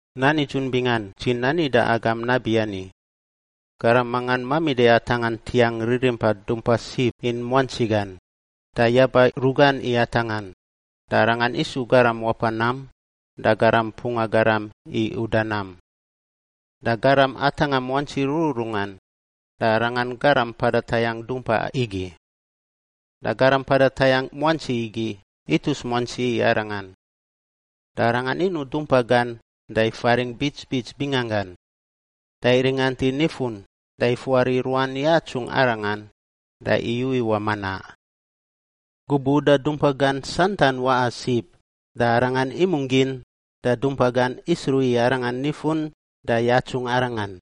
“Nan nidzun bingan dzi nani da agam nabiani, garam mangan mamida i atangꞌa ntiangꞌ ririmpa dumpa sib in muantsi gan, da yaba rugan i atangꞌan, da arangan isu garam wapa nam da garam mpunga garam i uda nam. Da garam atangꞌa muantsi rururungan da arangan garam mpada tayangꞌ dumpa igi. Da garam mpada tayangꞌ muantsi igi itus muantsi i arangan. Da arangan inuꞌ dumpa gan da ifaringꞌ bits bits binganggan, da iringant i nifun da ifuari ruan yatsungꞌ arangan da iyu iwaꞌ manaꞌ. Gubuꞌ uda dumpa gan santan waꞌa sib, da arangan imungꞌ gin da dumpa gan isruꞌ i arangan nifun da yatsungꞌ arangan.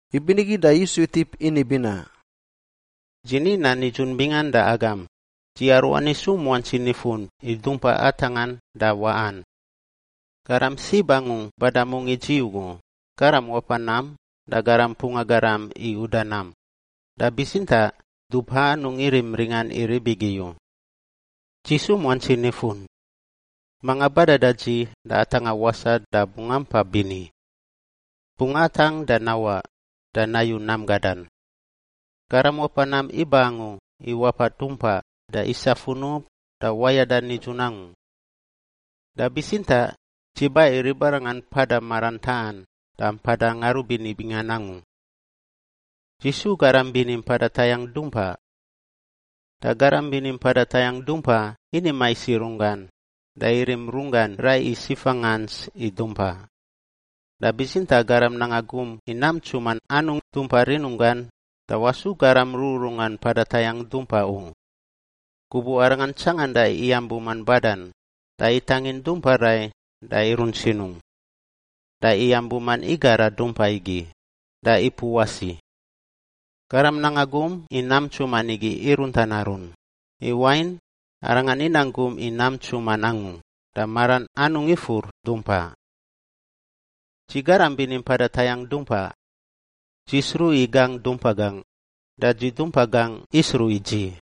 Ibinigi da Yisu itip ini binaꞌ, “Dzi ni nan nidzun bingan da agam, dzi aruani isu muantsi nifun i dumpa atangꞌan da waꞌan. Garam sib angu bada mungꞌ i dzi ugu garam wapa nam da garam mpunga garam i uda nam, da bitsintaꞌ dumpa anungꞌ irim ringan i rib igi u. Dzi su muantsi nifun. Manga bada da dzi da atangꞌa wasaꞌ da bungꞌ ampa bini. Bungꞌ atangꞌ da nawaꞌ da nayu nam gadan. Garam wapa nam iba angu i wapa dumpa da isa funub da wayada nidzun angu. Da bitsintaꞌ dzi ba i ribarangan mpada maran taꞌan da mpada ngarubini bingan angu. “Dzi su garam bini mpada tayangꞌ dumpa. Da garam bini mpada tayangꞌ dumpa ini mais i runggan da irim runggan rai i sifa ngants i dumpa. Da bitsintaꞌ garam nanga gum i nam ntsuman anungꞌ dumpa rinunggan da wasu garam rururungan mpada tayangꞌ dumpa u. Gubuꞌ arangan tsanganda iyam buman badan, da itangin dumpa rai da irunt sinungꞌ. Da iyam buman igara dumpa igi da ipuꞌ wasi. Garam nanga gum i nam ntsuman igi irunt an arun, i wain arangan inang gum i nam ntsuman angu da maran anungꞌ ifur dumpa. “Dzi garam bini mpada tayangꞌ dumpa. Dzi sruꞌ i gangꞌ dumpa gangꞌ da dzi dumpa gangꞌ isruꞌ i dzi,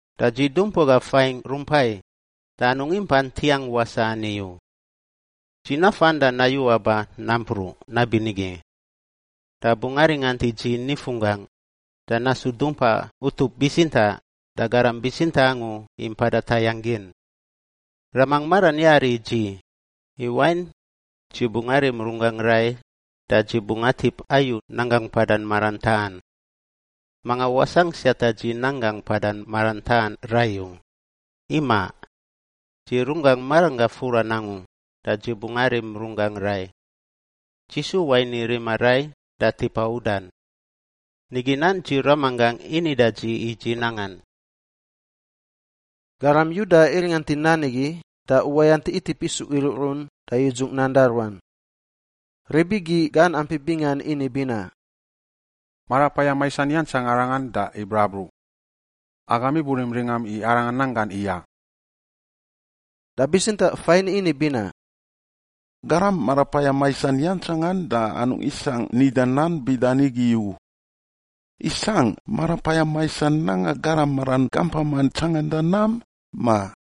Da dzi dumpa gangꞌ fain rumpai da anungꞌ impa ntiangꞌ wasaꞌ ani u. Dzi nafan da nayu aba nampruꞌ nabinigi. Da bungꞌ aringant i dzi nifunggangꞌ da nasu dumpa utup bitsintaꞌ da garam bitsintaꞌ angu i mpada tayangꞌ gin. Ramangꞌ maran yari i dzi, i wain dzi bungꞌ arim runggangꞌ rai da dzi bungꞌ atip ayu nanggangꞌ mpada maran taꞌan. Manga wasangꞌ siata dzi nanggangꞌ mpada maran taꞌan rai u, imaꞌ. Dzi runggangꞌ maranggangꞌ furan angu da dzi bungꞌ arim runggangꞌ rai. Dzi su wain i rima rai da tipa udan. Nigi nan dzi Ramanggangꞌ ini da dzi i dzi nangan.” Garam Yuda iringant i nan igi da uwayant itip isu iruꞌrun da yudzungꞌ nan da ruan. Rib igi gan ampi bingan ini binaꞌ, “Marapayam maisan iyantsang arangan da ibrabruꞌ! Agam iburim ringam i arangan nan gan iyaꞌ?” Da bitsintaꞌ fain ini binaꞌ, “Garam marapayam maisan yantsangan da anungꞌ isangꞌ nida nan bida nigi u. Isangꞌ marapayam maisan nanga garam maran gampaman tsanganda nam, ma?”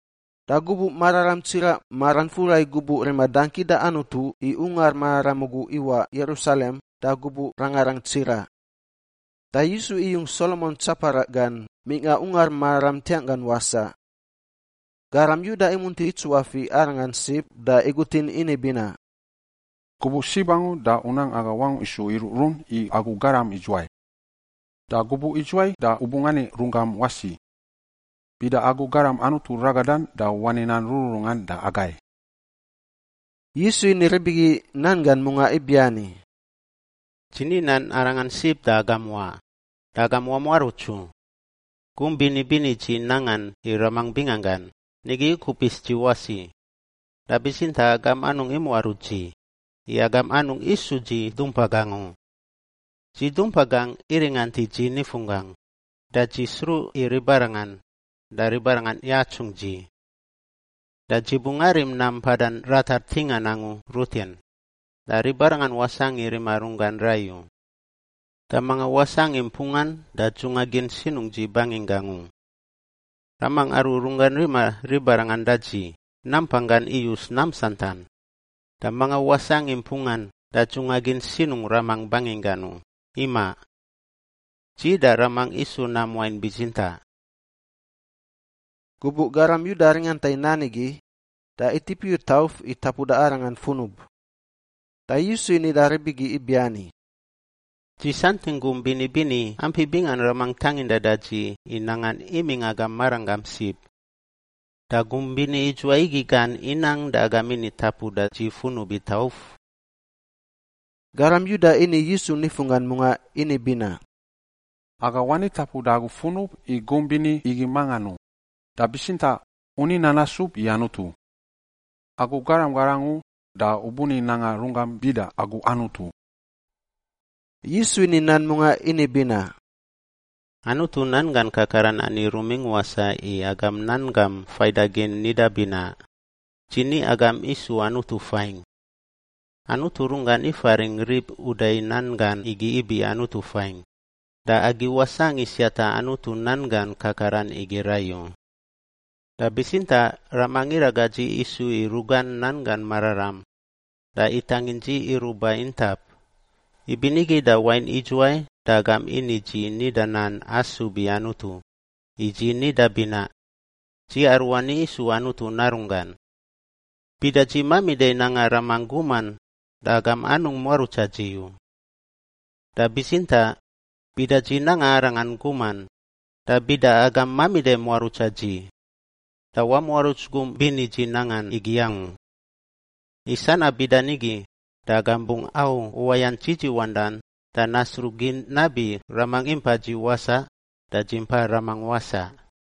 Da gubuꞌ mararam tsiraꞌ maran fura i gubuꞌ rima dangki da Anutu i Ungar Mararam ugu iwaꞌ Yerusalem da gubuꞌ rangarang tsiraꞌ. Da Yisu iyung Solomon tsaparaꞌ gan mingꞌa Ungar Mararam ntiangꞌ gan wasaꞌ. Garam Yuda imunti itsuafiꞌ Arangan sib da igutin ini binaꞌ, “Gubuꞌ sib angu da u nang aga wangungꞌ isu iruꞌrun i agu garam idzuwai. Da gubuꞌ idzuwai da u bungꞌ ani runggam wasi? Bida agu Garam Anutu Ragadan da wani nan rururungan da agai.” Yisu ini rib igi nan gan mungaꞌ ibiani, “Dzi ni nan arangan sib da agam wa, da agam wamuaruts u. Gum bini bini dzi nangan i Ramangꞌ binganggan, nigi ikupis dzi wasi, da bitsintaꞌ agam anungꞌ imuaruts dzi, i agam anungꞌ isu dzi dumpa gangꞌ u. Dzi dumpa gangꞌ iringant i dzi nifunggangꞌ, da dzi sruꞌ i ribarangan da ribarangan yatsungꞌ dzi. Da dzi bungꞌ arim nam mpada ratar ntingan angu rutin, da ribarangan wasangꞌ i rima runggan rai u. Da mangan wasangꞌ i mpungan da dzunga gin sinungꞌ dzi banginggangꞌ u. Ramangꞌ, aru runggan rima ribarangan da dzi, nampanggan iyus nam santan, da mangan wasangꞌ i mpungan da dzunga gin sinungꞌ Ramangꞌ banginggan u, imaꞌ. Dzi da Ramangꞌ isu nam wain bitsintaꞌ.” Gubuꞌ garam Yuda ringanta i nan igi, da itip iyu tauf i tapuda Arangan funub. Da Yisu ini da rib igi ibiani, “Dzi santingꞌ gum bini bini ampi bingan Ramangꞌ tangindan da dzi i nangan imingꞌ agam maranggam sib. Da gum bini idzuwai igi gan inang da agam ini tapuda dzi funub i tauf?” Garam Yuda ini Yisu nifunggan mungaꞌ ini binaꞌ, “Aga wani tapuda agu funub i gum bini igi mangan u, da bitsintaꞌ u ni nan asub i Anutu. Agu garam gar angu da u buni nanga runggam bida agu Anutu.” Yisu ini nan mungaꞌ ini binaꞌ, “Anutu nan gan kakaran ani rumingꞌ wasaꞌ i agam nan gam faidagin nida binaꞌ, ‘Dzi ni, agam isu anutu fain.’ Anutu runggan ifaringꞌ rib uda i nan gan igi ibi anutu fain, da agi wasangꞌ i siata Anutu nan gan kakaran igi rai u. Da bitsintaꞌ Ramangꞌ iraga dzi isu i rugan nanggan mararam da itangin dzi iruꞌ ba intap. Ibinigi da wain idzuwai da agam ini dzi nida nan asub i Anutu i dzi nida binaꞌ, ‘Dzi aruani isu Anutu Narunggan’? Bida dzi mamida i nanga Ramangꞌ guman, da agam anungꞌ muarutsa dzi u. Da bitsintaꞌ bida dzi nanga Arangan guman da bida agam mamida muarutsa dzi, da wamuaruts gum bini dzi nangan igi angu. I sanab bida nigi da agam bungꞌ au uwayant dzidziwandan da nasruꞌ gin nabi Ramangꞌ impa dzi wasaꞌ da dzi impa Ramangꞌ wasaꞌ.”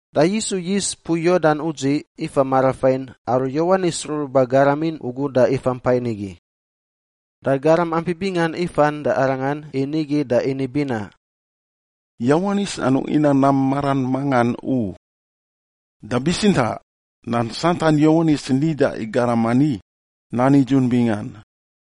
Da Yisu yis mpui Yordan udziꞌ ifa marafain aru Yowanis ruruba garamin ugu da ifampa nigi. Da garam ampi bingan ifan da Arangan i nigi da ini binaꞌ, “Yowanis anungꞌ inang nam maran mangan u. Da bitsintaꞌ nan santan Yowanis nida i garam ani nan nidzun bingan.”